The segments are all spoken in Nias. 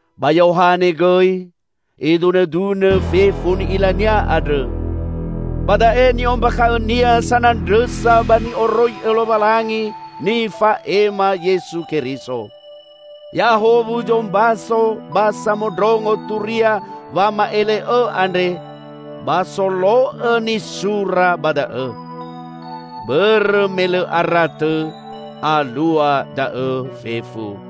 Ba Yohane gõi idunõdunõ fefu ni'ilania andrõ; ba da'e ni'ombakha'õnia sanandrõsa ba ni'oroi'õ Lowalangi nifa'ema Yesu Keriso. Ya'ahowu zombaso ba samondrongo turia wama'ele'õ andre ba solo'õ nisura ba da'õ. Bõrõ me lõ ara tõ alua da'õ fefu.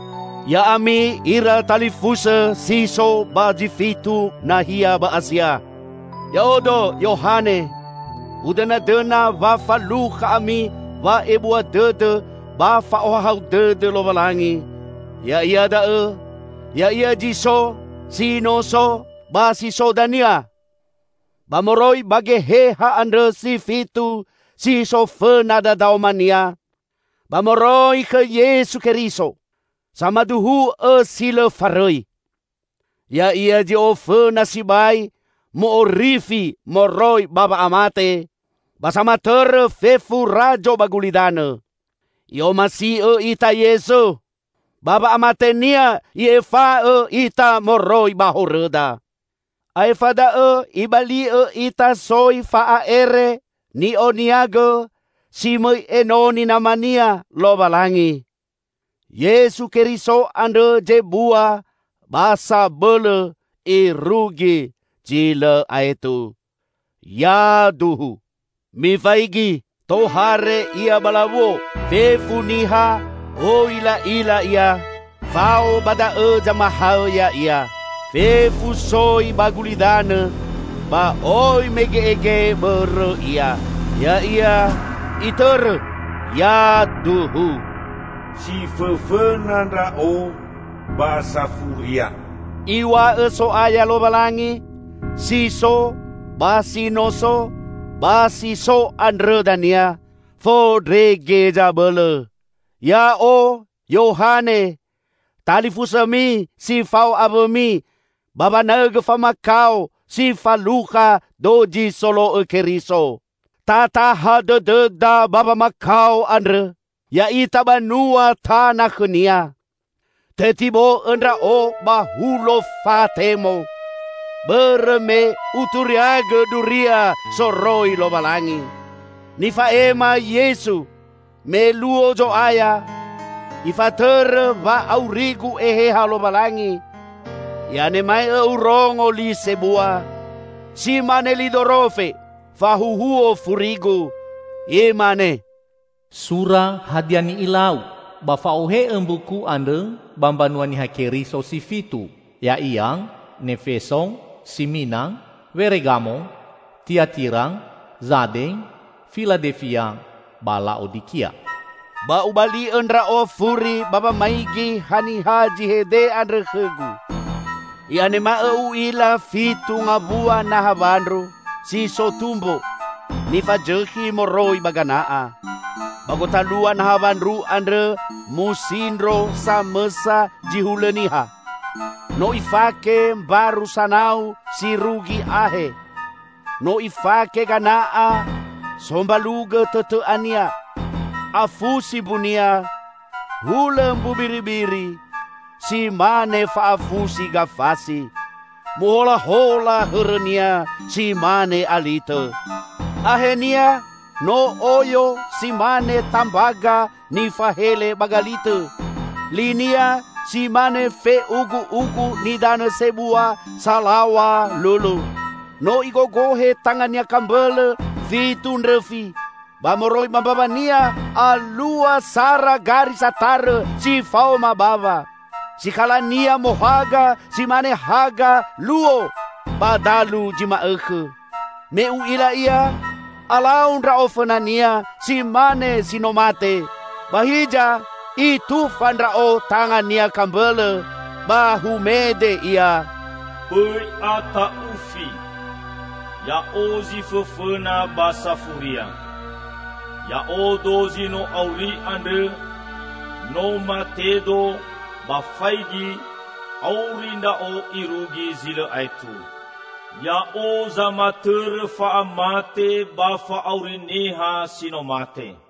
Ya'ami ira talifusõ si so ba zi fitu nahia ba Asia! Ya'odo, Yohane, udõnadõna wa falukha ami wa'ebua dõdõ ba fa'ohahau dõdõ Lowalangi -- ya'ia da'õ, Ya'ia zi so, si no so, ba si so dania -- ba moroi ba Geheha andrõ si fitu si so fõna dadaoma-Nia, ba moroi khõ Yesu Keriso, samaduhu'õ si lõ farõi. Ya'ia zi ofõna sibai mu'orifi moroi ba wa'amate ba samatõrõ fefu razo ba gulidanõ. I'omasi'õ ita Yesu, ba wa'amate-Nia I'efa'õ ita moroi ba horõda. Aefa da'õ Ibali'õ ita soi fa'a'ere ni'oniagõ, si mõi enoni Nama-Nia, Lowalangi. Yesu Keriso andrõ zebua ba sabõlõ irugi zi lõ aetu. Yaduhu! Mifaigi, tohare Ia ba lawuo! Fefu niha oi la'ila Ia, fao ba da'õ zamahõ Ya'ia. Fefu soi ba gulidanõ ba oi mege'ege bõrõ Ia. Ya'ia, itõrõ! Yaduhu! "Si fõfõna Ndra'o, ba Safuria," Iw̃a'õ So'aya Lowalangi, si so, ba si no so, ba si so andrõ dania, Fondrege Zabõlõ. Ya'o, Yohane! Talifusõmi si fao awõmi ba wanaõgõ famakao si falukha dozi solo'õ Keriso. Tataha dõdõda ba wamakao andrõ, ya'ita banua tana khõ-Nia. Tetibo'õ ndra'o ba Hulo Fatemo, bõrõ me uturiaigõ duria soroi Lowalangi, nifa'ema Yesu. Me luo Zo'aya, Ifatõrõ wa'aurigu Eheha Lowalangi, i'anema'õ urongo li sebua -- si mane li dorofe -- fahuhuo furigu. Imane, "Sura hadia ni'ilau, ba fa'ohe'õ mbuku andrõ ba mbanua Niha Keriso si fitu, ya'ia; Nefeso, Simina, Feregamo, Tiatira, Zade, Filadefia, ba La'odikia." Ba ubali'õ ndra'o furi ba wamaigi haniha zi hede andrõ khõgu. I'anema'õ u'ila fitu ngawua naha wandru -- si so tumbo -- nifazõkhi moroi ba gana'a. Ba gotalua naha wandru andrõ musindro samõsa zi hulõ niha. No Ifake mbaru sanau si rugi ahe. No Ifake gana'a sombalugõ tõtõ'a-Nia. Afusi mbu-Nia hulõ mbu mbiribiri, si mane fa'afusi gafasi. Moholahola hõrõ-Nia si mane alitõ; ahe-Nia no oyo si mane tambaga nifahele ba galitõ. Li-Nia si mane fe'ugu'ugu nidanõ sebua salaw̃a lulu. No Igogohe tanga-Nia kambõlõ fitu ndrõfi, ba moroi ba mbawa-Nia alua sara gari satarõ si faoma bawa. Sikhala-Nia mohaga si mane haga luo ba dalu zi ma'õkhõ. Me u'ila Ia, alau ndra'o fõna-Nia si mane si no mate. Ba hiza, Itufa ndra'o tanga-Nia kambõlõ, ba humede Ia, "Bõi ata'ufi! Ya'o zi Fõfõna ba Safuria. Ya'odo zi no auri andrõ! No mate-Do, ba faigi, auri Ndra'o irugi zi lõ aetu. Ya'o zamatõrõ fa'amate, ba fa'auri niha si no mate.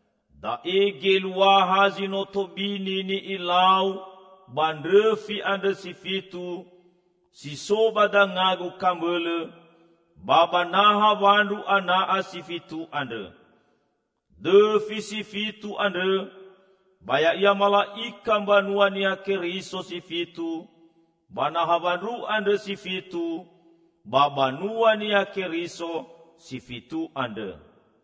Da'e geluaha zi no tobini ni'ilau ba ndrõfi andrõ si fitu, si so ba danga-Gu kambõlõ, ba ba naha wandru ana'a si fitu andrõ. Dõfi si fitu andrõ ba ya'ia mala'ika mbanua Niha Keriso si fitu, ba naha wandru andrõ si fitu ba banua Niha Keriso si fitu andrõ."